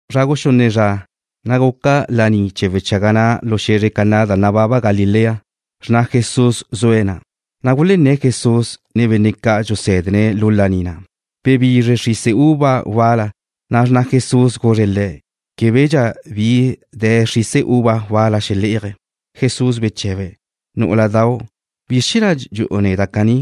Zra guxunne zra, na' guca laní chee̱ wechaga na' lu xe̱zre Caná da nababa Galilea. Xrna Jesús zue̱' na', na' zua nu gunné̱ Jesús, ne benne' ca' dxusé̱dene̱' lu laní na'. Bebizre xrise uva wal-la, na' xrna Jesús guzre̱' Le̱': ―Québedxa bi de̱ xrise uva wal-la xelé'aje̱'. Jesús beche̱be̱': ―Nú'uladau', ¿bizr chee̱ na' dxu'u neda' caní?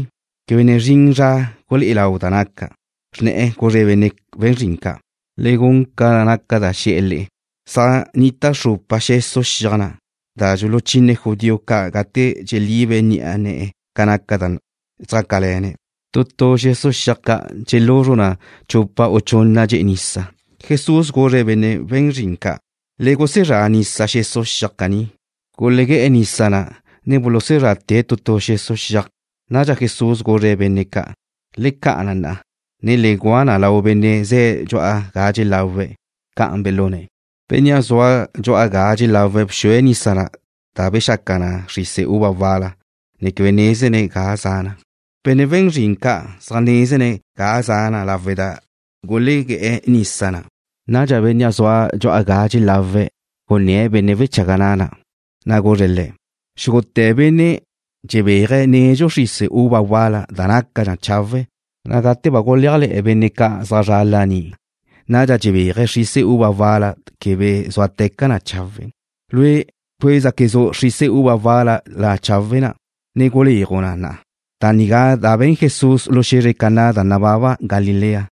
Quebe ne zrin zra gulé'e lau da naca'. Xrne̱'e̱ guzre̱' benne' we̱n zrin ca': ―Le gun ca naca da xe̱'e̱ le'e. Zaj nnita xrupa xesu' xiaj na', da dxuluchine judío ca' gate dxelibe ni'a ne̱'e̱ ca naca da zjácale̱ne̱'. Tu tu xesu' xiaj ca' dxeluzru na chupa u chunna dxe'e nisa. Jesús guzre̱' benne' we̱n zrin ca': ―Le gusezrá nisa xesu' xiaj caní. Gulegué̱'e̱ nisa na, ne bulusuzrate̱' tu tu xesu' xiaj ca'. Nadxa Jesús guzre̱' benne' ca': ―Le ca'a na, na'a, ne le gua na lau benne' ze̱' dxu'a ga dxelawe̱'. Ca'an belune̱'. Bénnea' zue̱' dxu'a ga dxelawe̱' bxue̱' nisa na' da bexaca na xrise uva wal-la, ne quebe nézene̱' ga za na. Benne' we̱n zrin ca' zaj nézene̱' ga za na lawe' da gulegué̱'e̱ nisa na'. Nadxa bénnea' zue̱' dxu'a ga dxelawe̱' gunné̱' benne' wechaga na', na' guzre̱' le̱': ―Xúgute̱ benne' dxelebéaje̱' nedxu xrise uva wal-la nácadxa chawe', na' gate ba gulé'ajle̱'e̱ benne' ca' zaj zre̱'e̱ laní, nadxa dxelebéaje̱' xrise uva wal-la quebe zúateca chawe'. Lue' bcuézaquezu' xrise uva wal-la chawe' na', ne guléaju' na na'a. Da nigá da be̱n Jesús lu xe̱zre Caná da nababa Galilea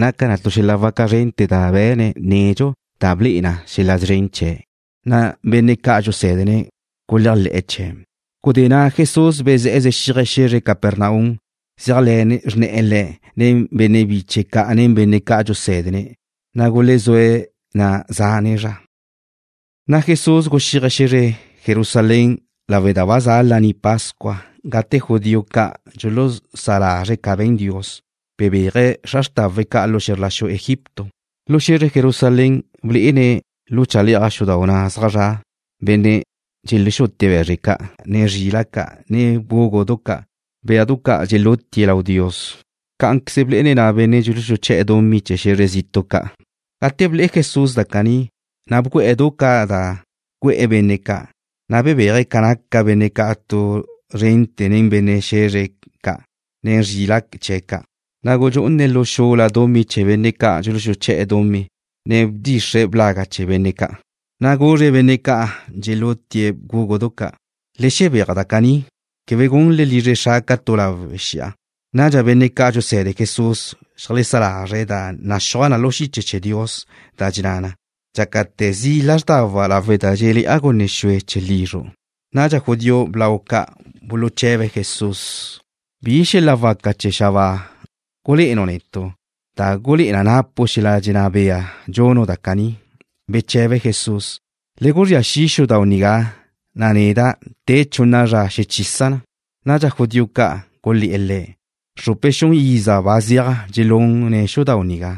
naca na tu xel-la' waca zrente̱ da be̱ne̱' nedxu, da ble'e na xel-la' szren chee̱', na' benne' ca' dxusé̱dene̱' guléajle̱'e̱ chee̱'. Gudé na' Jesús bezé̱'e̱ zexíaje̱' xe̱zre Capernaum, zéajle̱ xrne̱'e̱ Le̱' nen benne' biche̱' ca', ne benne' ca' dxusé̱dene̱'. Na' gulezúe̱' na' zane' zra. Na' Jesús guxíaje̱' xe̱zre Jerusalén lawe' da ba za Laní Pascua gate benne' judío ca' dxulusá lazre̱' ca be̱n Dios, bebéaje̱' xra xrtawe̱' ca' lu xe̱zr la xu Egipto. Lu xe̱zre Jerusalén blé'ene̱' lu chale'aj xudau' na' zaj zra' benne' dxelexutie̱' be̱zre ca', ne zrila' ca', ne bgúgudu ca', béadu ca' dxelutie̱' lau Dios. Cá'anqueze blé'ene̱' na' benne' dxuluxuché̱'e̱ dumí chee̱ xe̱zr zitu' ca'. Gate ble'e Jesús da caní, na' bgu'e̱ du ca' da güe̱'e̱ benne' ca', na' bebéaje̱' ca naca benne' ca' tu zrente̱ nen be̱zre chee̱' ca', ne zrila' chee̱' ca'. Na' gudxú'une̱' lu xula dumí chee̱ benne' ca' dxuluxuché̱'e̱ dumí, ne bdxixre̱' blaga' ca' chee̱ benne' ca'. Na' guzre̱' benne' ca' dxelexutie̱' bgúgudu ca': ―¡Le xebéaj da caní! Quebe gunle lizre Xra' ca tu lawe' xi'a. Nadxa benne' ca' dxuse̱de Jesús xeajlesá lazre̱' da naxúaj na lu xiche chee̱ Dios, da dxenná na: Dxácate̱ zi' lázrdawa' lawe' da dxé'le̱'a gunne xue chee̱ lizru'. Nadxa judío blau ca' buluche̱be̱' Jesús: ―¿Bi xel-la' waca da za xabáa gulé'enu' netu' da gulé'e na napu' xel-la' dxenná bea dxunu' da caní? Beche̱be Jesús: ―Le guzría xi' xudau' nigá, na' neda', te chunna zra xechisa' na. Nadxa judío ca' gulé̱'e̱ Le̱': ―Xrupe xun iza ba zeaj dxelune̱' xudau' nigá,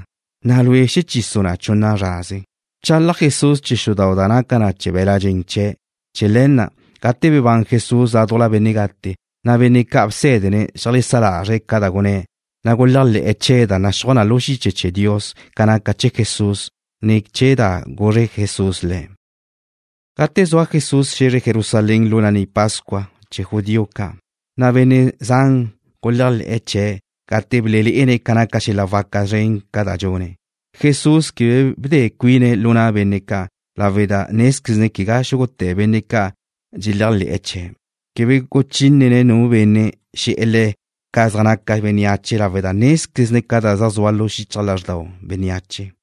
na' Lue', ¿xechisu' na chunna zraze? Bchalaj Jesús chee̱ xudau' na' da naca na be̱l-la' dxen chee̱'. Chee̱ le̱ na', gate bebán Jesús ládujla benne' gate, na' benne' ca' bsé̱dene̱' xeajlesá lazre̱' ca da gunné̱', na' guléajle̱'e̱ chee̱ da naxúaj na lu xiche chee̱ Dios ca naca chee̱ Jesús, ne chee̱ da guzre Jesús le̱'. Gate zua Jesús xe̱zre Jerusalén lu Laní Pascua chee̱ judío ca', na' benne' zan guléajle̱'e̱ chee̱' gate belelé'ene̱' ca naca xel-la' waca zren ca' da dxune̱'. Jesús quebe bde cuine̱' lu na' benne' ca' lawe' da nézquezne̱' quegá xúgute̱ benne' ca' dxeléajle̱'e̱ chee̱'. Quebe guchínene̱' nu benne' xe̱'e̱ Le̱' ca zaj naca bénneache lawe' da nézquezne̱' ca da zaj xu'u xichaj lázxdau bénneache.